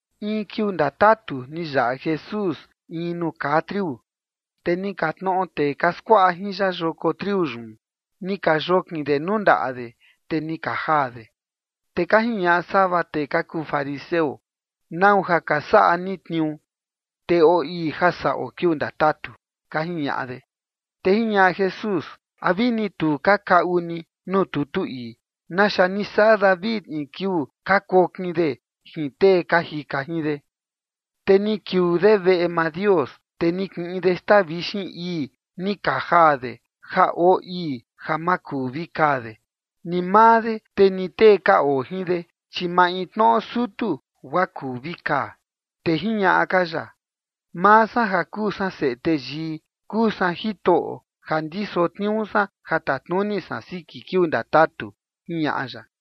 In kiuu ndatutu ni yaꞌa Jesús in nuu kaa triu, te ni ka tnoꞌo tee ka skuaꞌa jin ya yoko triu yun, ni ka yokin de nuu ndaꞌa de, te ni ka jaa de. Te ka jiñaꞌa sava tee ka kuu fariseo: ―¿Nau ja ka saꞌa ni tniuu? Te oo ii ja saꞌo kiuu ndatatu ―ka jiñaꞌa de. Te jiñaꞌa Jesús: ―¿A vini tu ka kaꞌu ni nuu tutu ii naxa ni saꞌa David in kiuu ka kokin de jin tee ka jika jin de? Te ni kiuu de veꞌe maa Dios, te ni kiꞌin de xtaa vixin ii ni ka jaa de ja oo ii ja ma kuu vi kaa de, ni maa de, te ni tee ka oo jin de, chi maintnoꞌo sutu guaa kuu vi kaa. Te jiñaꞌa ka ya: ―Maa san ja kuu san Seꞌe Teyii kuu san Jitoꞌo ja ndiso tniuu san ja tatnuni san siki kiuu ndatatu ―jiñaꞌa ya.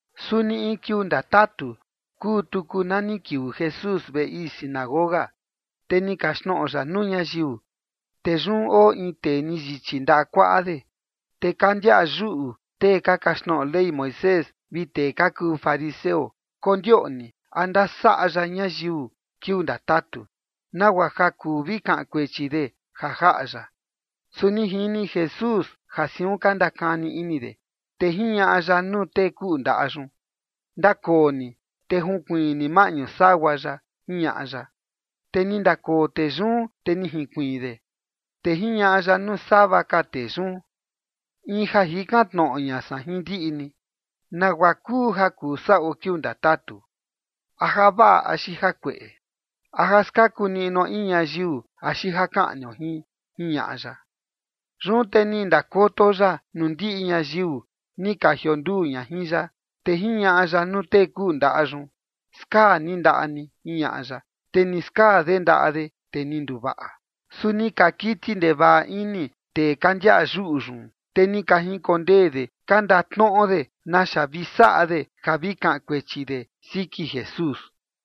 Suni in kiuu ndatatu kuu tuku na ni kiuu Jesús veꞌe ii sinagoga, te ni kaxtnoꞌo ya nuu ñayiu. Te yun oo in tee ni yichi ndaꞌa kuaꞌa de. Te ka ndiaꞌa yuꞌu tee ka kaxtnoꞌo Ley Moisés vi tee ka kuu fariseo, kondioꞌni a ndasaꞌa ya ñayiu kiuu ndatatu, nagua ja kuu vi kaꞌan kuechi de ja jaꞌa ya. Su ni jini Jesús ja siun ka ndakani ini de, te jiñaꞌa ya nuu tee kuꞌu ndaꞌa yun: ―Ndakoo ni te junkuiin ni maꞌñu sagua yaꞌa ―jiñaꞌa ya. Te ni ndakoo tee yun, te ni jinkuiin de. Te jiñaꞌa ya nuu sava ka tee yun: ―In ja jikan tnoꞌo ña san jin ndiꞌi ni, ¿nagua kuu ja kuu saꞌo kiuu ndatatu? ¿A javaꞌa axi jakueꞌe? ¿A ja skaku niꞌnuo in ñayiu axi ja kaꞌnio jin? ―jiñaꞌa ya. Yun te ni ndakoto ya nuu ndiꞌi ñayiu ni ka jionduu ña jin ya, te jiñaꞌa ya nuu tee kuꞌu ndaꞌa yun: ―Skaa ni ndaꞌa ni ―jiñaꞌa ya. Te ni skaa de ndaꞌa de, te ni nduvaꞌa. Su ni ka kiti ndevaꞌa ini tee ka ndiaꞌa yuꞌu yun, te ni ka jinkondee de ka ndatnoꞌo de naxa vi saꞌa de ja vi kaꞌan kuechi de siki Jesús.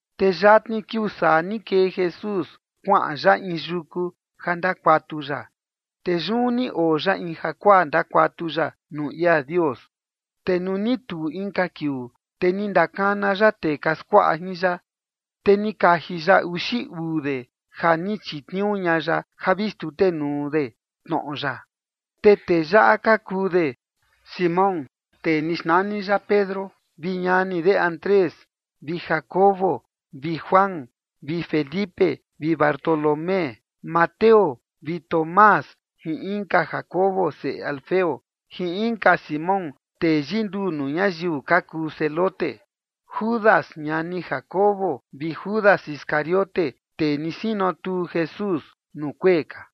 Te yatni kiuu saa ni kee Jesús kuaꞌan ya in yuku ja ndakuatu ya. Te yun ni oo ya in jakuaa ndakuatu ya nuu ia Dios. Te nuu ni tuu inka kiuu, te ni ndakana ya tee ka skuaꞌa jin ya, te ni kaji ya uxi uu de ja ni chitniuu ña ya ja vi xtutenuu de tnoꞌo ya. Te tee yaꞌa ka kuu de: Simón, tee ni xnani ya Pedro, vi ñani de Andrés, vi Jacobo vi Juan, vi Felipe vi Bartolomé, Mateo vi Tomás jin inka Jacobo seꞌe Alfeo, jin inka Simón tee yinduu nuu ñayiu ka kuu Zelote, Judas ñani Jacobo, vi Judas Iscariote tee ni sinotuu Jesús nuu kuee ka.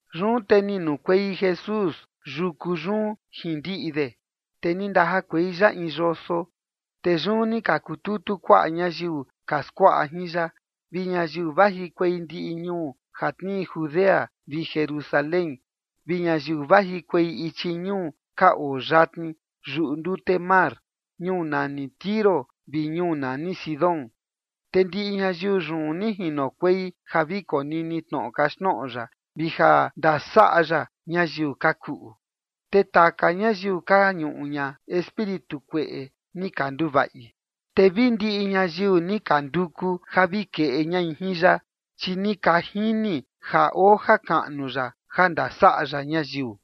Yun te ni nukuei Jesús yuku yun jin ndiꞌi de, te ni ndajakuei ya in yoso. Te yun ni ka kututu kuaꞌa ñayiu ka skuaꞌa jin ya, vi ñayiu vajikuei ndiꞌi ñuu ja tnii Judea vi Jerusalén, vi ñayiu vajikuei ichi ñuu ka oo yatni yuꞌu ndute mar, ñuu nani Tiro vi ñuu nani Sidón. Te ndiꞌi ñayiu yun ni jinokuei ja vi konini tnoꞌo kaxtnoꞌo ya vi ja ndasaꞌa ya ñayiu ka kuꞌu. Te taka ñayiu ka ñuꞌu ña espíritu kueꞌe ni ka nduvaꞌi. Te vi ndiꞌi ñayiu ni ka nduku ja vi keꞌe ñai jin ya, chi ni ka jini ja oo jakaꞌnu ya ja ndasaꞌa ya ñayiu.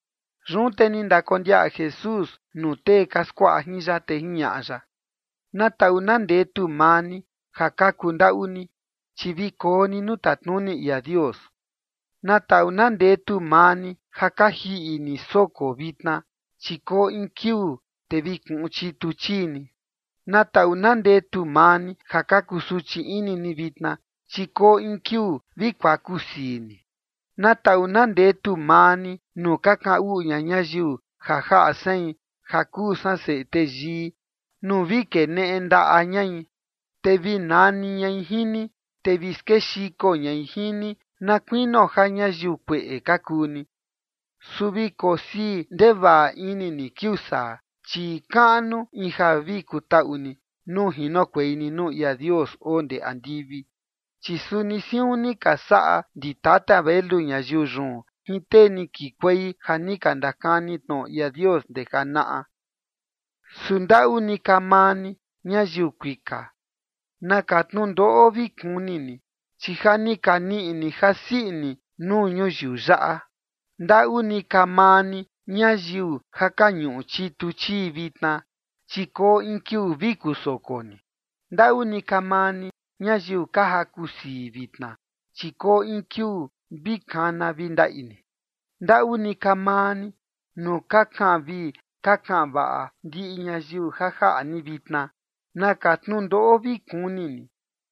Yun te ni ndakondiaꞌa Jesús nuu tee ka skuaꞌa jin ya, te jiñaꞌa ya: ―Na taꞌu na ndetu maa ni ja ka kundaꞌu ni, chi vi koo ni nuu tatnuni ia Dios. ’Na taꞌu na ndetu maa ni ja ka jiꞌi ni soko vitna, chi koo in kiuu te vi kuꞌun chitu chii ni. ’Na taꞌu na ndetu maa ni ja ka kusuchi ini ni vitna, chi koo in kiuu vi kuakusii ni. ’Na taꞌu na ndetu maa ni nuu ka kaꞌan uꞌu ña ñayiu ja jaꞌa sein ja kuu san Seꞌe Teyii nuu vi keneꞌe ndaꞌa ñai, te vi nani ñai jin ni, te vi skexiko ñai jin ni na kuinio ja ñayiu kueꞌe ka kuu ni. Su vi kosii ndevaꞌa ini ni kiuu saa, chi kaꞌnu in ja vi kutaꞌu ni nuu jinokuei ni nuu ia Dios oo ndee andivi, chi suni siun ni ka saꞌa ndi tata velu ñayiu yun jin tee ni kikuei ja ni ka ndakani tnoꞌo ia Dios ndee janaꞌa. ’Su ndaꞌu ni ka maa ni, ñayiu kuika. ¡Naka tnundoꞌo vi kuni ni! Chi ja ni ka niꞌi ni jasii ini nuu ñuyiu yaꞌa. ’Ndaꞌu ni ka maa ni, ñayiu ja ka ñuꞌu chitu chii vitna, chi koo in kiuu vi kusoko ni. ’Ndaꞌu ni ka maa ni, ñayiu ka jakusii vitna, chi koo in kiuu vi kana vi ndaꞌi ni. ’Ndaꞌu ni ka maa ni nuu ka kaꞌan vii ka kaꞌan vaꞌa ndiꞌi ñayiu ja jaꞌa ni vitna. ¡Naka tnundoꞌo vi kuni ni!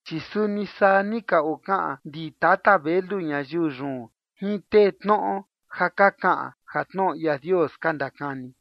Chi suni saa ni ka okaꞌan ndi tata velu ñayiu yun jin tee tnoꞌo ja ka kaꞌan ja tnoꞌo ia Dios ka ndakani.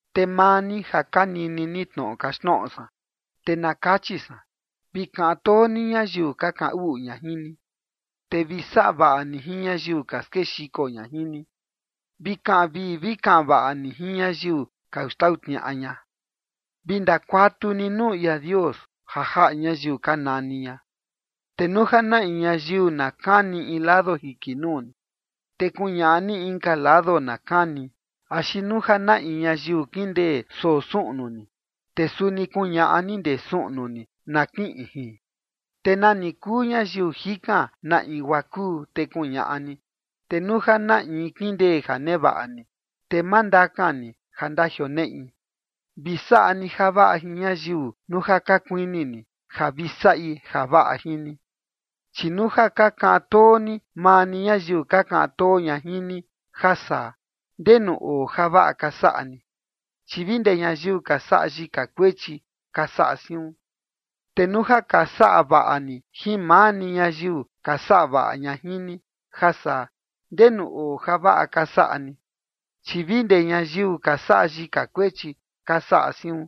’Te maa ni ja ka nini ni tnoꞌo kaxtnoꞌo san, te na kachi san: Vi kaꞌan too ni ñayiu ka kaꞌan uꞌu ña jin ni. Te vi saꞌa vaꞌa ni jin ñayiu ka skexiko ña jin ni. Vi kaꞌan vii vi kaꞌan vaꞌa ni jin ñayiu ka xtau tniaꞌa ña. Vi ndakuatu ni nuu ia Dios ja jaꞌa ñayiu ka nani ña. Te nuu ja na in ñayiu na kani in lado jiki nuu ni, te kuñaꞌa ni inka lado na kani; axi nuu ja na in ñayiu kindee soo suꞌnu ni, te suni kuñaꞌa ni ndee suꞌnu ni na kiꞌin jin. Te nani kuu ñayiu jikan na in guaa kuu, te kuñaꞌa ni. Te nuu ja na in kindee ja nevaꞌa ni, te ma ndakan ni ja ndajioneꞌi. Vi saꞌa ni javaꞌa jin ñayiu, nuu ja ka kuini ni ja vi saꞌi javaꞌa jin ni. ’Chi nuu ja ka kaꞌan too ni maa ni ñayiu ka kaꞌan too ña jin ni, ja saa, ¿ndenu oo javaꞌa ka saꞌa ni? Chi vi ndee ñayiu ka saꞌa yika kuechi ka saꞌa siun. Te nuu ja ka saꞌa vaꞌa ni jin maa ni ñayiu ka saꞌa vaꞌa ña jin ni, ja saa, ¿ndenu oo javaꞌa ka saꞌa ni? Chi vi ndee ñayiu ka saꞌa yika kuechi ka saꞌa siun.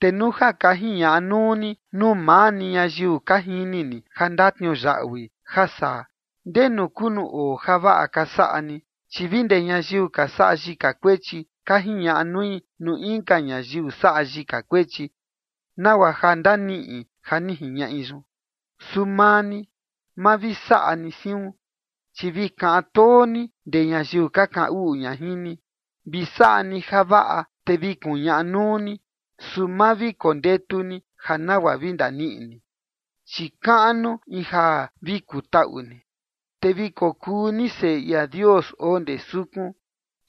Te nuu ja ka jiñaꞌa nuu ni nuu maa ni ñayiu ka jini ni ja ndatniuyaꞌui, ja saa, ¿ndenu kuu nuu oo javaꞌa ka saꞌa ni? Chi vi ndee ñayiu ka saꞌa yika kuechi ka jiñaꞌa nui nuu inka ñayiu saꞌa yika kuechi, nagua ja ndaniꞌi ja ni jiñaꞌi yun. Su maa ni, ma vi saꞌa ni siun. Chi vi kaꞌan too ni ndee ñayiu ka kaꞌan uꞌu ña jin ni. Vi saꞌa ni javaꞌa, te vi kuñaꞌa nuu ni, su ma vi kondetu ni ja nagua vi ndaniꞌi ni. Chi kaꞌnu in ja vi kutaꞌu ni, te vi kokuu ni seꞌe ia Dios oo ndee sukun,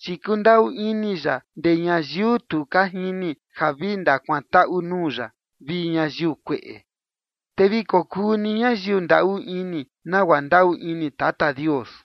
chi kundaꞌu ini ya ndee ñayiu tu ka jini ja vi ndakuantaꞌu nuu ya vi ñayiu kueꞌe. Te vi kokuu ni ñayiu ndaꞌu ini nagua ndaꞌu ini Tata Dios.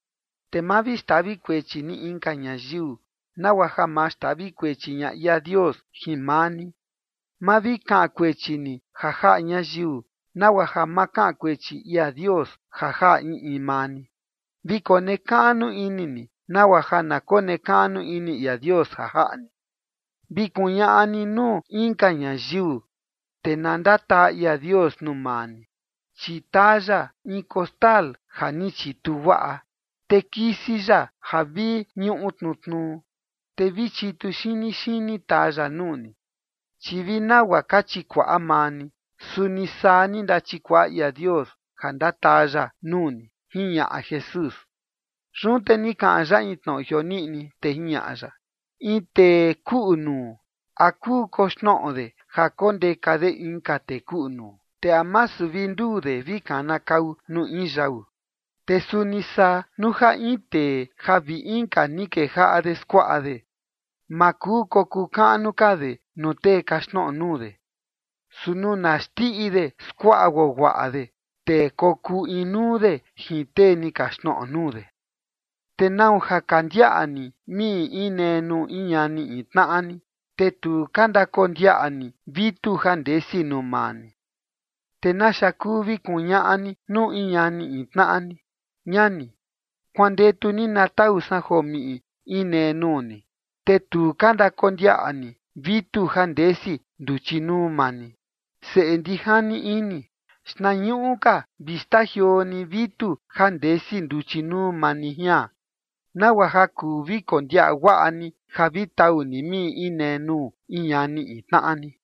’Te ma vi xtavi kuechi ni inka ñayiu nagua ja ma xtavi kuechi ña ia Dios jin maa ni. Ma vi kaꞌan kuechi ni ja jaꞌa ñayiu, nagua ja ma kaꞌan kuechi ia Dios ja jaꞌa in in maa ni. Vi konekaꞌnu ini ni, nagua ja na konekaꞌnu ini ia Dios ja jaꞌa ni. Vi kuñaꞌa ni nuu inka ñayiu, te na ndataa ia Dios nuu maa ni, chi taa ya in kostal ja ni chitu guaꞌa, te kisi ya ja vi ñuꞌu tnutnuu, te vi chitu xini xini taa ya nuu ni. Chi vi nagua ka chikuaꞌa maa ni, suni saa ni ndachikuaꞌa ia Dios ja ndataa ya nuu ni, ―jiñaꞌa Jesús. Yun te ni kaꞌan ya in tnoꞌo jioniꞌni, te jiñaꞌa ya: ―In tee kuꞌu nuu, ¿a kuu koxnoꞌo de ja kondeka de inka tee kuꞌu nuu? ¿Te a masu vi nduu de vi kanakau nuu in yau? Te suni saa nuu ja in tee ja vi inka ni kejaꞌa de skuaꞌa de, ma kuu kokuu kaꞌnu ka de nuu tee kaxtnoꞌo nuu de. Su nuu na xndiꞌi de skuaꞌa guaguaꞌa de, te kokuu inuu de jin tee ni kaxtnoꞌo nuu de. ’¿Te nau ja ka ndiaꞌa ni miꞌi inee nuu in ñani in tnaꞌa ni? Te tu ka ndakondiaꞌa ni vitu ja ndesi nuu maa ni. Te ¿naxa kuu vi kuñaꞌa ni nuu in ñani in tnaꞌa ni: “Ñani, kuandetu ni na tau san joo miꞌi inee nuu ni”, te tu ka ndakondiaꞌa ni vitu ja ndesi nduchi nuu maa ni? Seꞌe ndijani ini, xtnañuꞌu ka vi xtajioo ni vitu ja ndesi nduchi nuu maa ni jian, nagua ja kuu vi kondiaꞌa guaꞌa ni ja vi tau ni miꞌi inee nuu in ñani in tnaꞌa ni.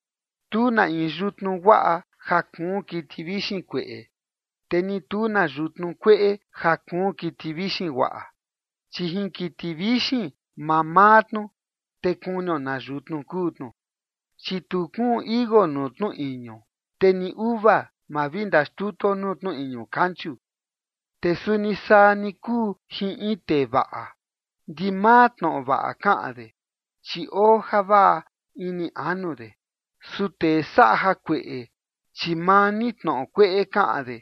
’Tu na in yutnu guaꞌa ja kuun kiti vixin kueꞌe, te ni tu na yutnu kueꞌe ja kuun kiti vixin guaꞌa. Chi jin kiti vixin mamaa tnu, te kunio na yutnu kuu tnu. Chi tu kuun tichi iuu nuu tnu iñu, te ni uva ma vi ndaxtutuo nuu tnu iñu kanchu. Te suni saa ni kuu jin in tee vaꞌa: Ndimaa tnoꞌo vaꞌa kaꞌan de, chi oo javaꞌa ini anu de. Su tee saꞌa jakueꞌe, chi maa ni tnoꞌo kueꞌe kaꞌan de,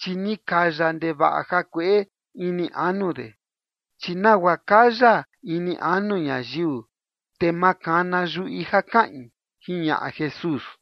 chi ni kaya ndevaꞌa jakueꞌe ini anu de. Chi nagua kaya ini anu ñayiu, te makana yuꞌi ja kaꞌin ―jiñaꞌa Jesús.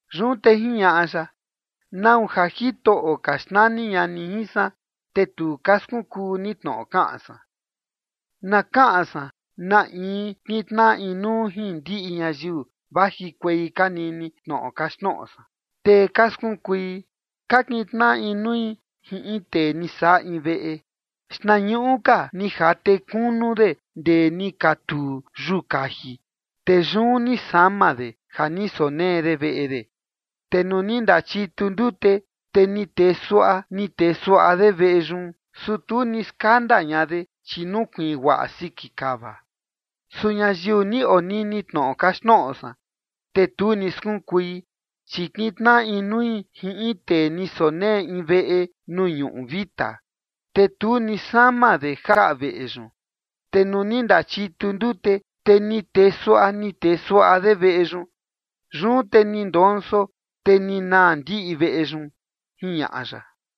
Yun te jiñaꞌa ya: ―¿Nau ja Jitoꞌo ka xnani ña ni jin san, te tu ka skunkuu ni tnoꞌo kaꞌan san? Na kaꞌan san na in kintnaꞌa inuu jin ndiꞌi ñayiu vajikuei ka nini tnoꞌo kaxtnoꞌo san, te ka skunkui. Ka kintnaꞌa inui jin in tee ni saꞌa in veꞌe. Xtnañuꞌu ka ni jate kunu de ndee ni katuu yuu kaji, te yun ni sama de ja ni sonee de veꞌe de. Te nuu ni ndachitu ndute, te ni tee suaꞌa ni tee suaꞌa de veꞌe yun, su tu ni skanda ña de, chi nukuiin guaꞌa siki kava. Su ñayiu ni onini tnoꞌo kaxtnoꞌo san, te tu ni skunkui, chi kintnaꞌa inui jin in tee ni sonee in veꞌe nuu ñuꞌu vita, te tu ni sama de jaꞌa veꞌe yun. Te nuu ni ndachitu ndute, te ni tee suaꞌa ni tee suaꞌa de veꞌe yun. Yun te ni ndonso, te ni naa ndiꞌi veꞌe yun ―jiñaꞌa ya.